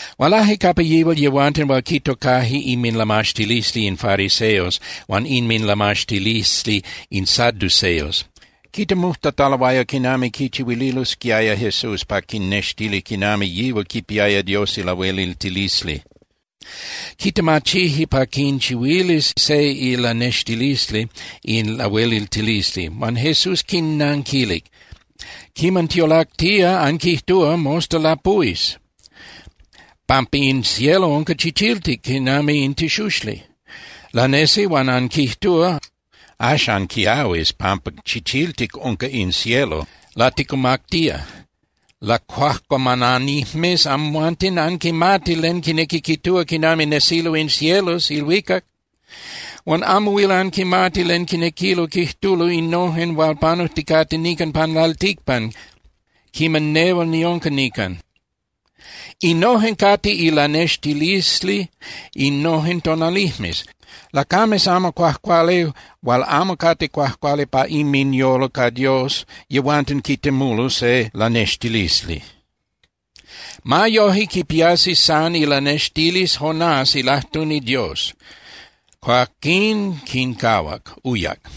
Hualaje capa yihual yehuanten hual quitocaje inminlamaxtilisli in fariseos huan inminlamaxtilisli in saduceos. Quitemujtataloaya quinami quichihuililosquiaya Jesús pa quinnextilis quinami yihual quipiaya Dios ilahueliltilisli. Quitemachije pa quinchihuilis se ilanextilisli in lahueliltilisli. Huan Jesús quinnanquilic: —Quiman tiolactía, anquijtúa: “Mosta lapuhuis, pampa in cielo unca chichiltic quinami in tixuxli.” Lanesi, huan anquijtúa: “Axan quiahuis pampa chichiltic unca in cielo, laticumactía.” ¡Lacuajcuamananijmes amhuanten! Anquimati len quinequi quijtúa quinami nesilo in cielos (ilhuicac), huan amo huil anquimati len quinequilo quijtulo innojen hual panujticate nican pan lalticpan quiman nehual niunca nican. Innojen cate ilanextilisli innojen tonalijmes. Lacames amo cuajcuali hual amo cate cuajcuali pa inminyolo ca Dios, yehuanten quitemulo se lanextilisli. Ma yoje, quipiasi san ilanextilisli Jonás ilajtuni Dios. Cuaquín quincahuac, uyac.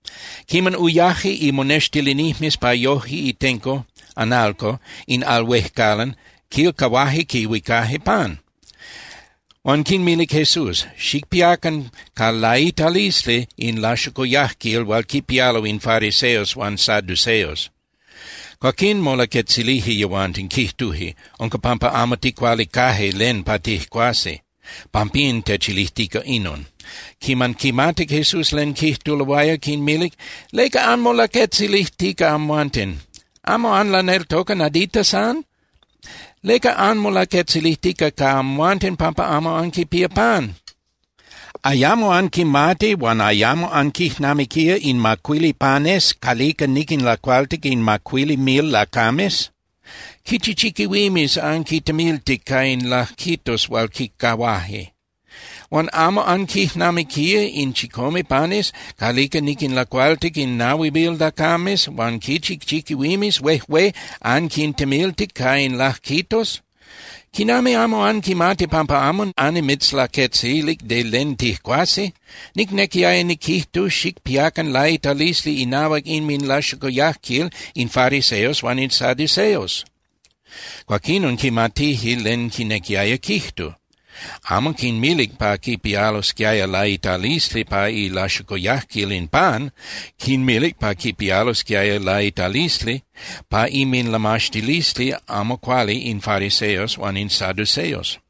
Quiman uyaje imonextilinijmes pa yojque itenco (analco) in al huejcalan, quilcahuaje quihuicaje pan. Huan quinmilic Jesús: —Xicpiacan ca laitalisli in laxocoyajquil hual quipialo in fariseos huan saduceos. Cuaquín molaquetzilije yehuanten, quijtuje: —Unca pampa amo ticualicaje len pa tijcuasi. Pampín techilijtica inon. Quiman quimatic Jesús len quijtuloaya, quinmilic: —¿Leca anmolaquetzilijtica amhuanten? ¿Amo anlaneltoca nadita san? ¿Leca anmolaquetzilijtica ca amhuanten pampa amo anquipía pan? ¿Ayamo anquimati huan ayamo anquijnamiquía in macuili panes calica niquinlacualtic in macuili mil lacames? ¿Quichi chiquihuimes anquintemiltic ca in lajquitos hual quincahuaje? Huan ¿amo anquijnamiquía in chicome panes calica niquinlacualtic in nahui mil lacames huan quichi chiquihuimes huejué anquintemiltic ca in lajquitos? ¿Quinami amo anquimati pampa amo annimitzlaquetzilic de len tijcuasi? Nicnequiaya niquijtu xicpiacan laitalisli inahuac inminlaxocoyajquil in fariseos huan in saduceos. Cuaquinon quimatije len quinequiaya quijtu. Amo quinmilic pa quipialosquiaya laitalisli pa ilaxocuyajquil in pan. Quinmilic pa quipialosquiaya laitalisli pa inminlamaxtilisli amo cuali in fariseos huan in saduceos.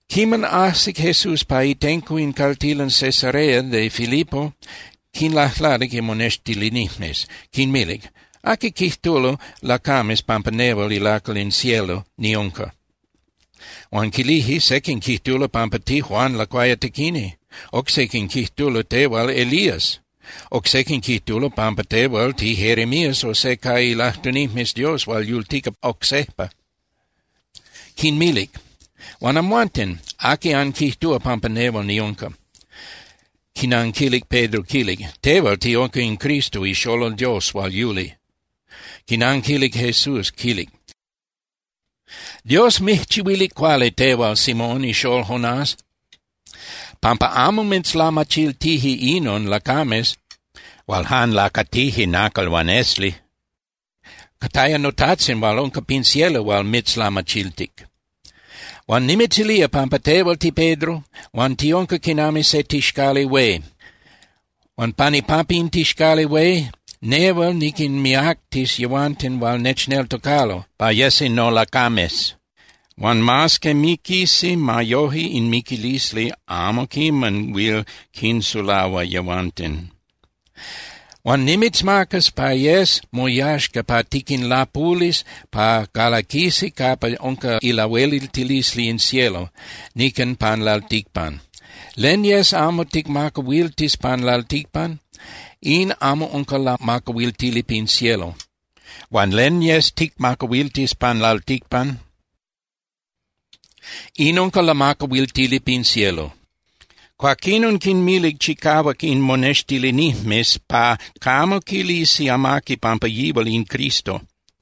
Quiman ajsic Jesús pa itenco in caltilan Cesarea de Filipo, quinlajlanic imonextilinijmes, quinmilic: —¿Aqui quijtulo lacames pampa nehual ilacal in cielo niunca? Huan quilije: —Sequin quijtulo pampa tiJuan Lacuayatequini, oc sequin quijtulo tehual Elías, oc sequin quijtulo pampa tehual tiJeremías o se ca ilajtunijmes Dios hual yultica oc sejpa. Quinmilic: —Huan amhuanten, ¿aqui anquijtúa pampa nehual niunca? Quinanquilic Pedro, quilic: —Tehual tiunca in Cristo ixolol Dios hual yuli. Quinanquilic Jesús quilic: —Dios mijchihuilic cuali tehual, Simón ixól Jonás, pampa amo mitzlamachiltije inon lacames hual jan lacatije nacal huan esli. Cataya noTajtzin hual unca pin cielo hual mitzlamachiltic. Huan nimitzilía pampa tehual tiPedro hual tiunca quinami se tixcali hué. Huan pan ipampa in tixcali hué, nehual niquinmiactis yehuanten hual nechneltocalo pa yesi nolacames. Huan mas que miquisi, ma yoje in miquilisli amo quiman huil quinsulahua yehuanten. Huan nimitzmacas pa yes moyaxca pa tiquinlapulis pa calaquisi capa unca ilahueliltilisli in cielo nican pan lalticpan. Len yes amo ticmacahuiltis pan lalticpan, in amo unca lamacahuiltili pin cielo. Huan len yes ticmacahuiltis pan lalticpan, in unca lamacahuiltili pin cielo. Cuaquinon quinmilic chicahuac in monextilinijmes pa camo quilisi amaqui pampa yihual in Cristo.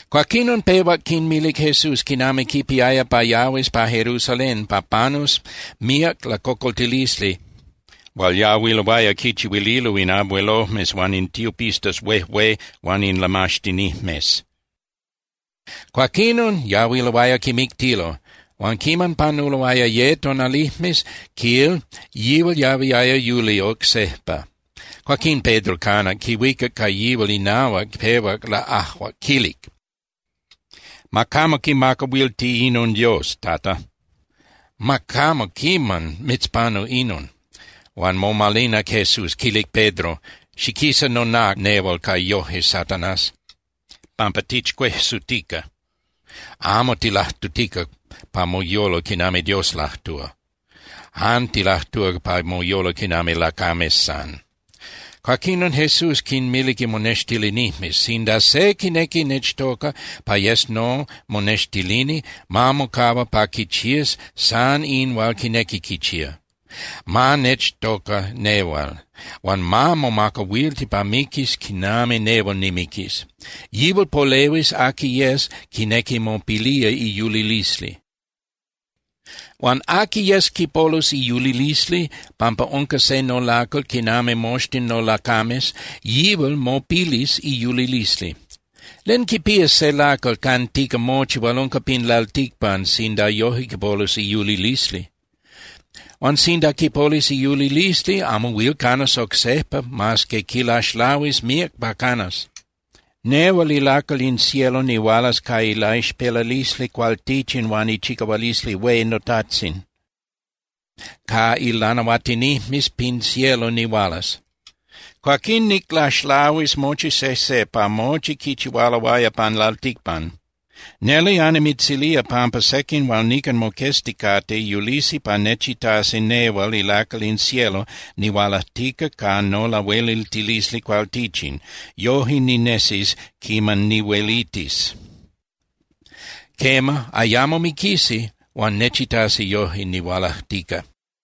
Cuaquinon pehuac quinmilic Jesús quinami quipiaya pa yahuis pa Jerusalén pa panus míac lacocoltilisli hual yahuiloaya quichihuililo in abuelojmes huan in tiopistas huejué huan in lamaxtinijmes. Cuaquinon yahuiloaya quimictilo. Huan quiman panuloaya ye tonalijmes, quil, yihual yahuiaya yuli oc sejpa. Cuaquín Pedro canac, quihuicac ca yihual inahuac, pehuac laꞌajuac, quilic: —Ma camo quimacahuilti inon Dios, Tata. Ma camo quiman mitzpanu inon. Huan momalinac Jesús, quilic Pedro: —¡Xiquisa nonác nehual ca yoje, Satanás!, pampa tichcuejsutica. Amo tilajtutica pa moyolo quinami Dios lajtúa. Jan tilajtúa pa moyolo quinami lacames san. Cuaquinon Jesús quinmilic imonextilinijmes: —Sinda se quinequi nechtoca pa yes nomonextilini, ma mocahua pa quichías san in hual quinequi quichía. Ma nechtoca nehual, huan ma momacahuilti pa miquis quinami nehual nimiquis. Yihual polehuis aqui yes quinequi mopilía iyulilisli. Huan aqui yes quipolus iyulilisli pampa unca se nolacal quinami moxtin nolacames, yihual mopilis iyulilisli. ¿Len quipías se lacal cantica mochi hual unca pin lalticpan sinda yoje quipolus iyulilisli? Huan sinda quipolus iyulilisli, amo huil canas oc sejpa mas que quilaxlahuis míac pa canas. Nehual ilacal in cielo nihualas ca ilaixpelalisli cualtichin huan ichicahualisli hué noTajtzin, ca ilanahuatinijmes pin cielo nihualas. Cuaquín niclaxlahuis mochi sejse pa mochi quichihualoaya pan lalticpan. Neli annimitzilía pampa sequin hual nican moquezticate yulisi pa nechitasi nehual ilacal in cielo nihualajtica ca nolahueliltilisli cualtichin, yoje ninesis quiman nihuelitis. Quema, ayamo miquisi, huan nechitasi yoje nihualajtica.